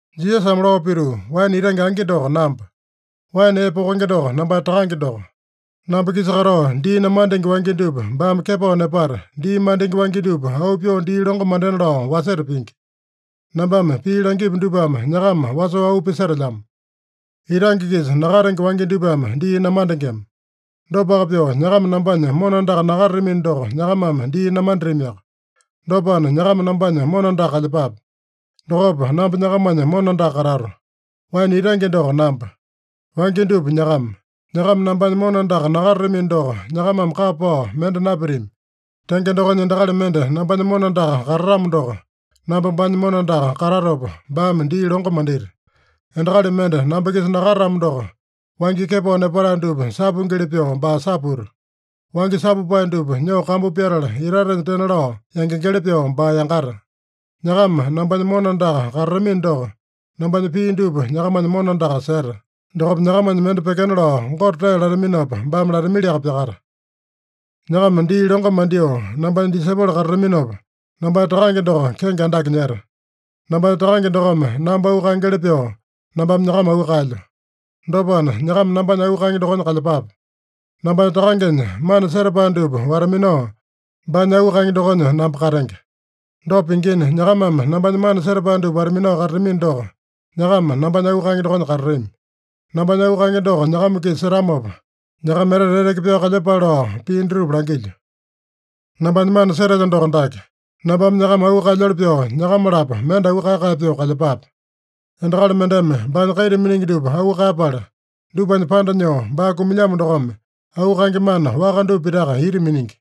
Jisasame lao pituu, “Waene itange angi doko namba. Waene ee pokenge doko nambanya Takange doko. Namba-kisa katao dii namandenge wangya dupa baame kepao nepata, dii mandenge wangya dupa auu pyoo dii longo mandena lao waseta pingi. Nambame pii langipu dupame nyakama wasoo auu pisetelyamo. Itange-kisa nakatenge wangya dupame dii namandengema. Dopaka pyoo, nyakama nambanya mona andaka nakatatamino doko, nyakamame dii namanditamiaka. Dopana, nyakama nambanya mona andaka kalyepape. Dokopa namba nyakamanya mona andaka katato. Waene itange doko namba. Wangya dupa nyakama. Nyakama nambanya mona andaka nakatatamino doko, nyakamame kapa pao mende napitami. Tenge dokonya, endakali mende nambanya mona andaka katatamo doko, namba baanya mona andaka katatopa, baame dii longo mandita. Endakali mende namba-kisa nakatatamo doko, wangya kepao nepatae dupa sapuingili pyoo, baa saputa. Wangya sapupae dupa nyoo kambu pyatala itatenya tena lao yangengeli pyoo baa yangata. Nyakama nambanya mona andaka katatamino doko, nambanya pii dupa nyakamanya mona andaka seta. Dokopa nyakamanya mende pyekena lao Gote tee lataminopa baame latamiliaka pyakata. Nyakama dii longo mandyoo nambanya disaipolo katataminopa, nambanya Takange doko kenge andake nyeta. Nambanya Takange dokome namba auu kaengeli pyoo, nambame nyakama auu kaelyo. Dopana, nyakama nambanya auu kaenge dokonya kalyepape. Nambanya Takangenya mana setapae dupa wata-minao, baanya auu kaenge dokonya namba katenge. Dopa pingina, nyakamame nambanya mana setapae dupa wata-minao katatamino doko, nyakama nambanya auu kaenge dokonya katatami. Nambanya auu kaenge doko nyakama-kisa setamopa, nyakama etete eteke pyao kalyepale lao pii dutupa langilyo. “Nambanya mana setelyo doko dake: Nambame nyakama auu kaelyoli pyoo nyakama-lapo mende auu kae-kae pyoo kalyepape. Endakali mendeme baanya kaita miningi dupa auu kaeyapala, dupanya panda nyoo baa kumilyamo dokome, auu kaenge mana waka dupa pitaka ita miningi.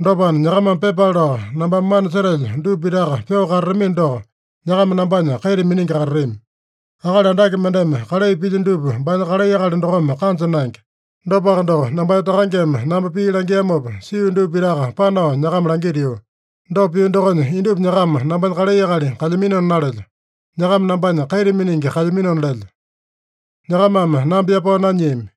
Dopana, nyakamame pyepale lao nambame mana setelyo dupa pitaka pyoo katatamino doko, nyakama nambanya kaita miningi katatami. Akali andake mendeme kalai pilya dupa baanya kalai akali dokome kanja naenge. Dopaka doko, nambanya Takangeme namba pii langiamopa sio dupa pitaka panao nyakama langitio. Dopa pio dokonya, indupa nyakama nambanya kalai akali kalyaminona nalelyo. Nyakama nambanya kaita miningi kalyaminona lelyo. Nyakamame namba yapao nanyiami.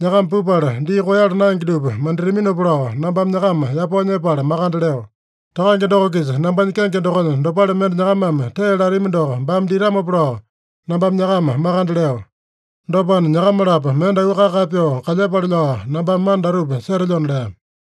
Nyakama pupala dii koeyala naenge dupa manditaminopa lao nambame nyakama yapao nyepala makande leo. Takange doko-kisa nambanya kenge dokonya dopale mende nyakamame tee latami doko baame ditamopa lao nambame nyakama makande leo. Dopana, nyakama-lapo mende auu kae-kae pyoo kalyepale lao nambame mana datupa setelyona” lea.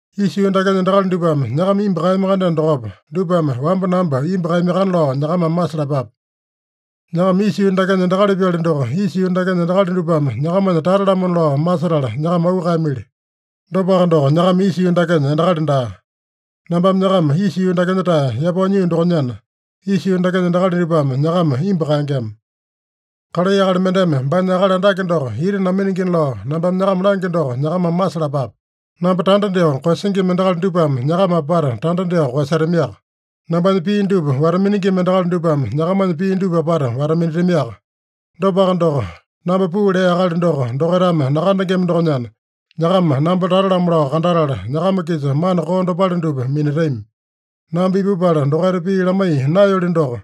“Isa yuu dakenya endakali dupame nyakama imbu kaeyami-kandeno dokopa, dupame wamba namba imbu kaeyamiakana lao nyakamame masalapape. Nyakama isa yuu dakenya endakali-pyali doko, isa yuu dakenya endakali dupame nyakamanya tata-lamona lao masetala nyakama auu kaeyamili. Dopaka doko, nyakama isa yuu dakenya endakali daa. Nambame nyakama isa yuu dakenya-tae yapao nyio dokonyana, isa yuu dakenya endakali dupame nyakama imbu kaengema. ‘Kalai akali mendeme baanya akali andake doko ita naminingina’ lao nambame nyakama langyo doko nyakamame masalapape. Namba tanda dyoo koeyasingima endakali dupame nyakama apata tanda dyoo koeyasetamiaka. Nambanya pii dupa wata-miningima endakali dupame nyakamanya pii dupa apata wata-minatamiaka. Dopaka doko, namba puu lea Akali doko dokaitame nakandengema dokonyana, nyakama namba tata-lamo lao kandatala, nyakama-kisa mana koo dopale dupa minatami. Namba ipupala dokaita pii lamaiya naeyoli doko,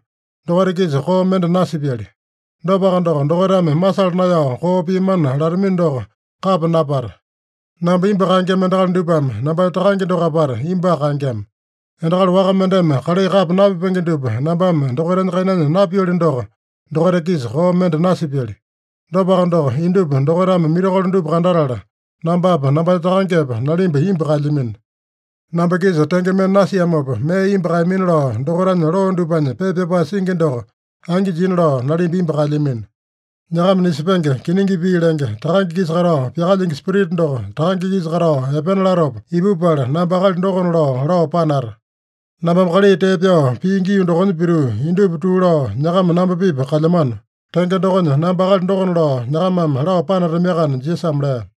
dokaita-kisa koo mende nasipyali. Dopaka doko, dokaitame masala naeyao koo piamana latamino doko kapa napata. Namba imbu kaengema endakali dupame nambanya Takange doko apata imbuaka kaengema. Endakali waka mendeme kalai kapa napipenge dupa nambame dokaitanya kainanya napioli doko, dokaita-kisa koo mende nasipyali. Dopaka doko, indupa dokaitame mirakolo dupa kandatala, nambapa, nambanya Takangepa, nalimba imbu kaelyamino. ‘Namba-kisa tenge mende nasiamopa, mee imbu kaeyamina’ lao dokaitanya loo dupanya pepa pyapae singi doko angi jina lao nalimba imbu kaelyamino. “Nyakama nisepenge, kiningi pii lenge, Takange-kisa katao pyakalyingi Spirita doko, Takange-kisa katao epena latopa ipupala, namba akali dokona lao, lao panata. Nambame kalai tee pyao pio gii dokonya pituu, indupa tuu lao, nyakama namba-pipa kalyamano. Tenge dokonya, namba akali dokona lao nyakamame lao panatamiakana” Jisasame lea.